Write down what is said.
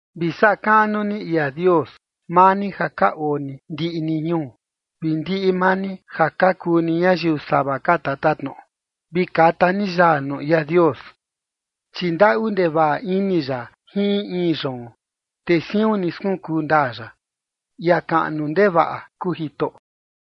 Vi saꞌa kaꞌnu ni ia Dios, maa ni ja ka oo ni ndiꞌi ni ñuu vi ndiꞌi maa ni ja ka kuu ni ñayiu sava ka tatatnoꞌo, vi kata ni yaa nuu ia Dios. Chi ndaꞌu ndevaꞌa ini ya jin in in yoon, te siun ni skunkuu ndaa ya. Ia kaꞌnu ndevaꞌa kuu Jitoꞌo.